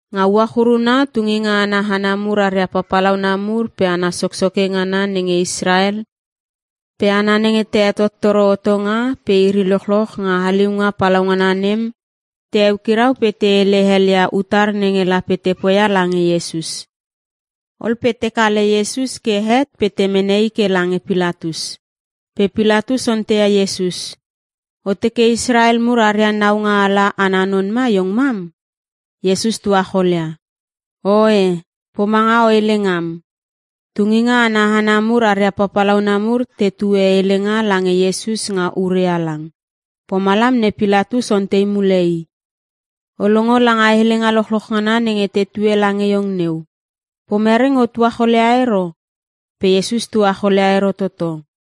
Nga uach uruna tunginga ana hana mur aria papalauna mur pe hana soksoke ngana nenge Israel pe hana nenge te hetottoro hotonga pe iri lochloch nga haliunga palaungana nem te eukirau pe te hele hel ia utar nenge lape te poia lange Iesus. Ol pe te kale Iesus ke het pe te mene i ke lange Pilatus. Pe Pilatus onteia Iesus, “O teke Israel mur aria naungaala ana non ma iong mam?” Iesus tuacholia, “Oe, pomanga o hele ngam.” Tunginga ana hana mur aria papalauna mur tetue helenga lange Iesus nga ure halang. Pomalam ne Pilatus ontei mule i, “O longo langa helenga lochloch ngana nenge tetue lange iong neu. Pomere nge o tuacholia ero?” Pe Iesus tuacholia ero toto.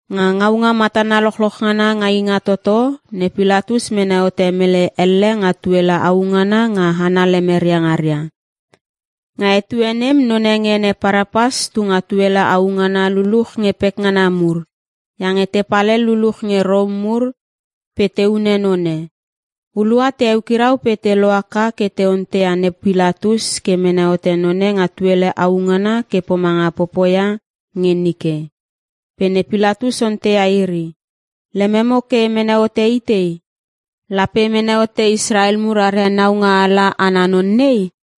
Nga ngaunga matana lochloch ngana nga Ingatoto ne Pilatus mene hote mele elle nga tuele au ngana nga hana lemeria ngaria. Nga etue nem none nge ene Parapas tu nga tuele au ngana luluch nge pekngana mur iange tepal hel luluch nge Rom mur pe te hune none. Hulua te eukirau pe te lohaka ke te onteia ne Pilatus ke mene hote none nga tuele au ngana ke pomanga popoia nge nike. Pe ne Pilatus onteia iri, “Lememo ke e mene hote itei? Lape e mene hote Israel mur aria naungaala ana non nei?”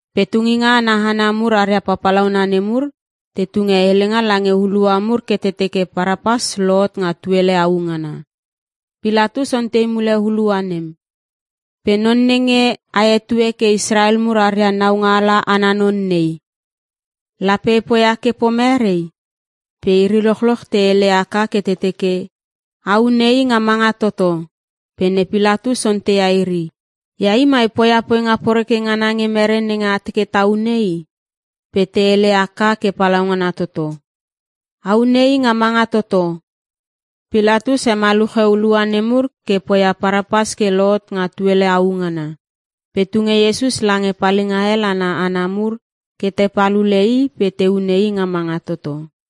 Pe tunginga ana hana mur aria papalauna nemur, te tunge helenga lange hulua mur ke te teke Parapas lohot nga tuele au ngana. Pilatus ontei mule hulua nem, “Pe non nenge a hetue ke Israel mur aria naungaala ana non nei, lape e poia ke pomere?” Pe Iri lochloch te hele aka ke te teke, “A hune i nga manga toto!” Pe ne Pilatus onteia iri, “Ia i mai poia poinga poreke ngana nge mere nenge a teke ta hune i?” Pe te hele haka ke palaungana toto, “A hune i nga manga toto!” Pilatus he maluche hulua nemur ke poia Parapas ke lohot nga tuele au ngana. Pe tunge Iesus lange palinga hel ana hana mur ke te pal ule i pe te hune i nga manga toto.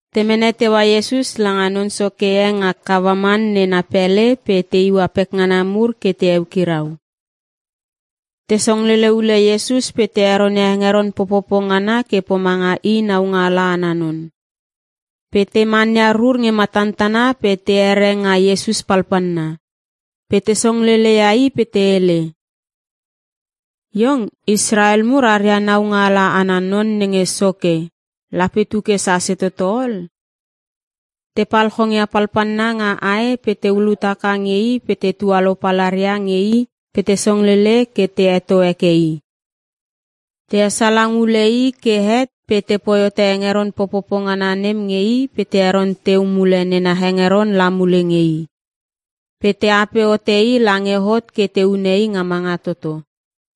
Te mene teua Iesus langa non soke e nga gavaman na pele pe te iua pekngaria mur ke te eukirau. Te songlele ule Iesus pe te heronia hengeron popopo ngana ke pomanga i naungaala ana non. Pe te mania rur nge matantana pe te here nga Iesus palpalna. Pe te songlele ia i pe te hele. “Iong Israel mur aria naungaala ana non nenge soke lape tu ke sase toto ol.” Tepal chongia palpalna nga ae pe te ulut haka nge i pe te tualou palaria nge i pe te songlele ke te heto heke i. Te esalang ule i ke het pe tepoi hote hengeron popopo ngana nem nge i pe te heron teu mule nena hengeron la mule nge i. Pe te ape hote i lange hot ke te hune i nga manga toto.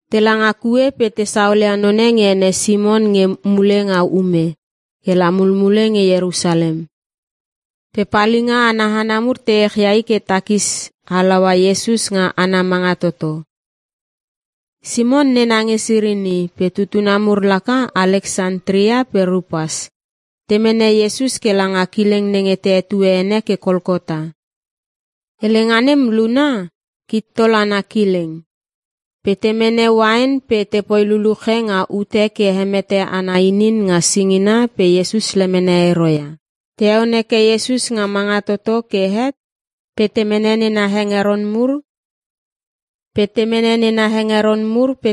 Tela nga kue pe te saolia none nge ene Simon nge mule nga ume ke la mulmule nge Ierusalem. Pe palinga ana hana mur te echia i ke takis halaua Iesus nga ana manga toto. (Simon nena nge Sirini pe tutuna mur laka Aleksantria pe Rupas) Te mene Iesus kela nga kileng nenge te hetue ene ke Kolkota. Helenga nem luna, “Kittol ana Kileng.” Pe te mene uain pe tepoi luluche nga ute ke hemete ana inin nga singina pe Iesus lemene ero ia. Te heon heke Iesus nga manga toto ke het pe te mene nena hengeron mur pe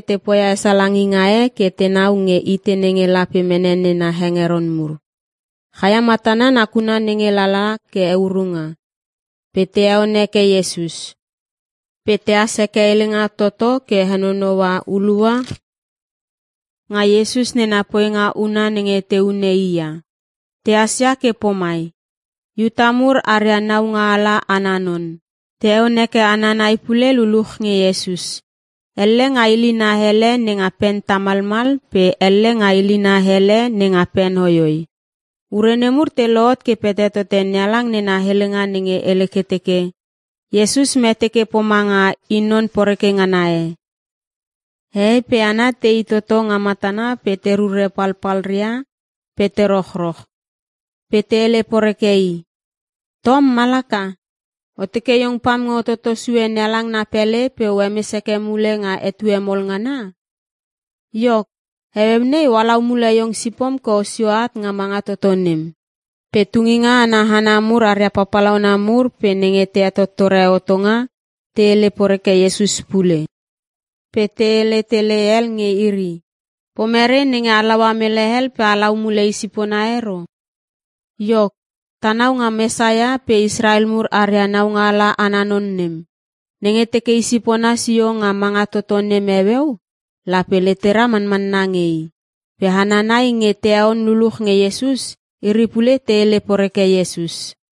te poia esalanginga e ke tenau nge itei nenge lape mene nena hengeron mur. Chaia matana nakuna nenge lala ke eurunga, pe te heon heke Iesus. Pe tehas heke helenga toto ke henonoua hulua nga Iesus nena poinga una nenge te hune i ia. Tehas ia ke pomai; “IUTA MUR ARIA NAUNGA ALA ANA NON.” Te heon heke hana nai pule luluch nge Iesus. Elle nga ilina hele nenga pen tamalmal pe elle nga ilina hele nenga pen hoihoi. Ure nemur te lohot ke pete tote NeHalang nena helenga nenge hele ke teke, “Iesus mete ke pomanga i non poreke ngana e.” Hehei pe hana tei toto nga matana pe te rure palpalria pe te rochroch. Pe te hele poreke i, “Tom malaka! O teke iong pam nge o toto sue NeHalang na pele pe o hemes heke mule nga etue mol ngana? Iok, heueu nei, o halau mule iong sipom ke osio at nga manga toto nem.” Pe tunginga ana hana mur aria papalauna mur pe nenge te hetottore hotonga, te hele poreke Iesus pule pe te hele tele hel nge iri, “Pomere nenge halaua mele hel pe halau mule isipona ero? Iok, tanau nga Mesaia pe Israel mur aria naungaala ana non nem. Nenge teke isipona sio nga manga toto nem heueu, lape letera manmanna nge i.” Pe hana nai nge te heon luluch nge Iesus, iri pule te hele poreke Iesus.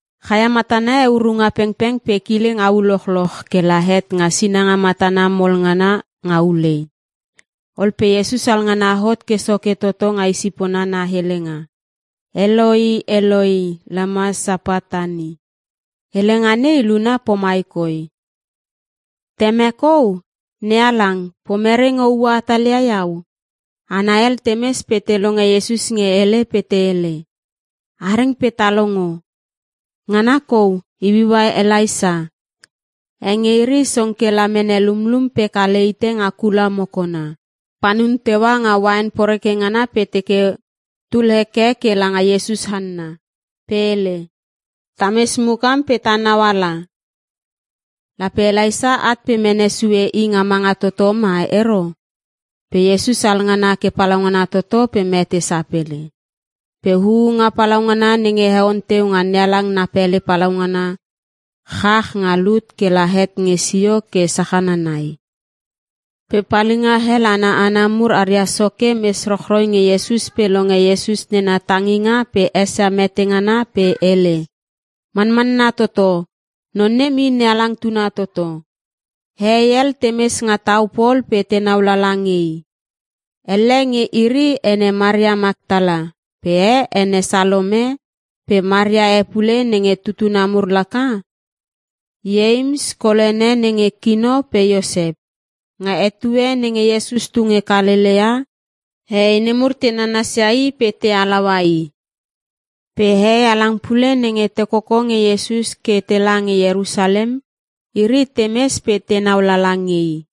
Chaia matana heurunga pengpeng pe kileng au lochloch ke la het nga sinanga matana mol ngana nga ulei. Ol pe Iesus alngana hot ke soke toto nga isipona na helenga, “Eloi, Eloi, lama sabachtani?” Helenga nei luna pomai koi, “Temek Ou! NeHalang, pomere nge oua hatalia iau?” Hana hel temes pe te longe Iesus nge hele pe te hele, “A reng pe ta longo. Ngana kou iuiua Elaisa!” E nge iri song kela mene lumlum pe kale hite nga kula mokona. Panun teua nga uain poreke ngana pe teke tul heke ke langa Iesus hanna. Pe hele, “Tames mukam pe ta nauala. Lape Elaisa at pe mene sue i nga manga toto ma ero?” Pe Iesus alngana ke palaungana toto pe mete sapele. Pe huunga palaungana nenge heon teu nga NeHalang na pele palaungana chach nga lut ke la het nge sio ke sachana nai. Pe palinga hel ana hana mur aria soke mes rochroi nge Iesus pe longe Iesus nena tanginga pe esia mete ngana pe hele, “Manmanna toto, non nem i NeHalang tuna toto.” Hehei hel temes nga tau pol pe tenau lala nge i. Elle nge iri, ene Maria Maktala pe e ene Salome pe Maria e pule nenge tutuna mur laka Ieims kol ene nenge kino pe Iosep. Nga etue nenge Iesus tu nge Kalelea, hehei nemur te nanasia i pe te halaua i. Pe hehei halang pule nenge te koko nge Iesus ke tela nge Ierusalem. Iri temes pe tenau lala nge i.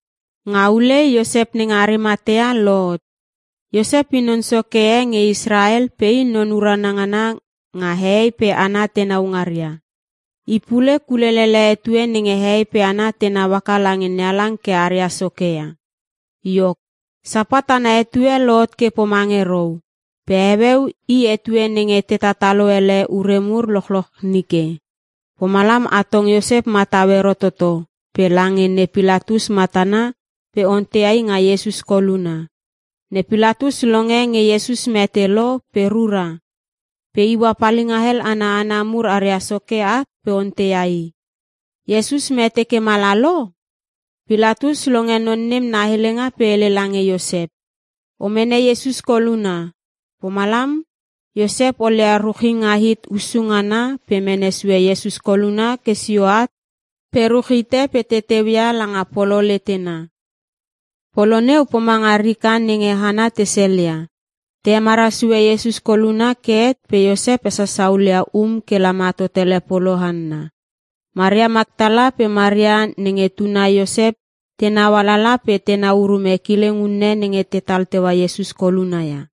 Nga ulei Iosep nenge Arimatea lohot. Iosep i non soke e nge Israel pe i non urana ngana nga hehei pe hana tenau ngaria. I pule kulelele etue nenge hehei pe hana tenau haka lange NeHalang ke aria soke ia. Iok, Sapat ana etue lohot ke pomange rou, pe heueu i etue nenge te tatalo ele ure mur lochloch nike. Pomalam atong Iosep matau ero toto pe langa ne Pilatus matana pe onteia i nga Iesus koluna. Ne Pilatus longe nge Iesus mete lo pe rura. Pe iua palinga hel ana hana mur aria soke at pe onteia i, “Iesus mete ke mala lo?” Pilatus longe non nem na helenga pe hele lange Iosep, “O mene Iesus koluna.” Pomalam Iosep olia ruchinga hit hussu ngana pe mene sue Iesus koluna ke sio at pe ruch hite pe te teuia langa polo letena. Polo neu pomanga rika nenge hana te selia. Te hemara sue Iesus koluna ke het pe Iosep hesasa hulia um kela ma totele polo hanna. Maria Maktala pe Maria nenge tuna Iosep tenau alala pe tenau urume kileng unne nenge tetal teua Iesus koluna ia.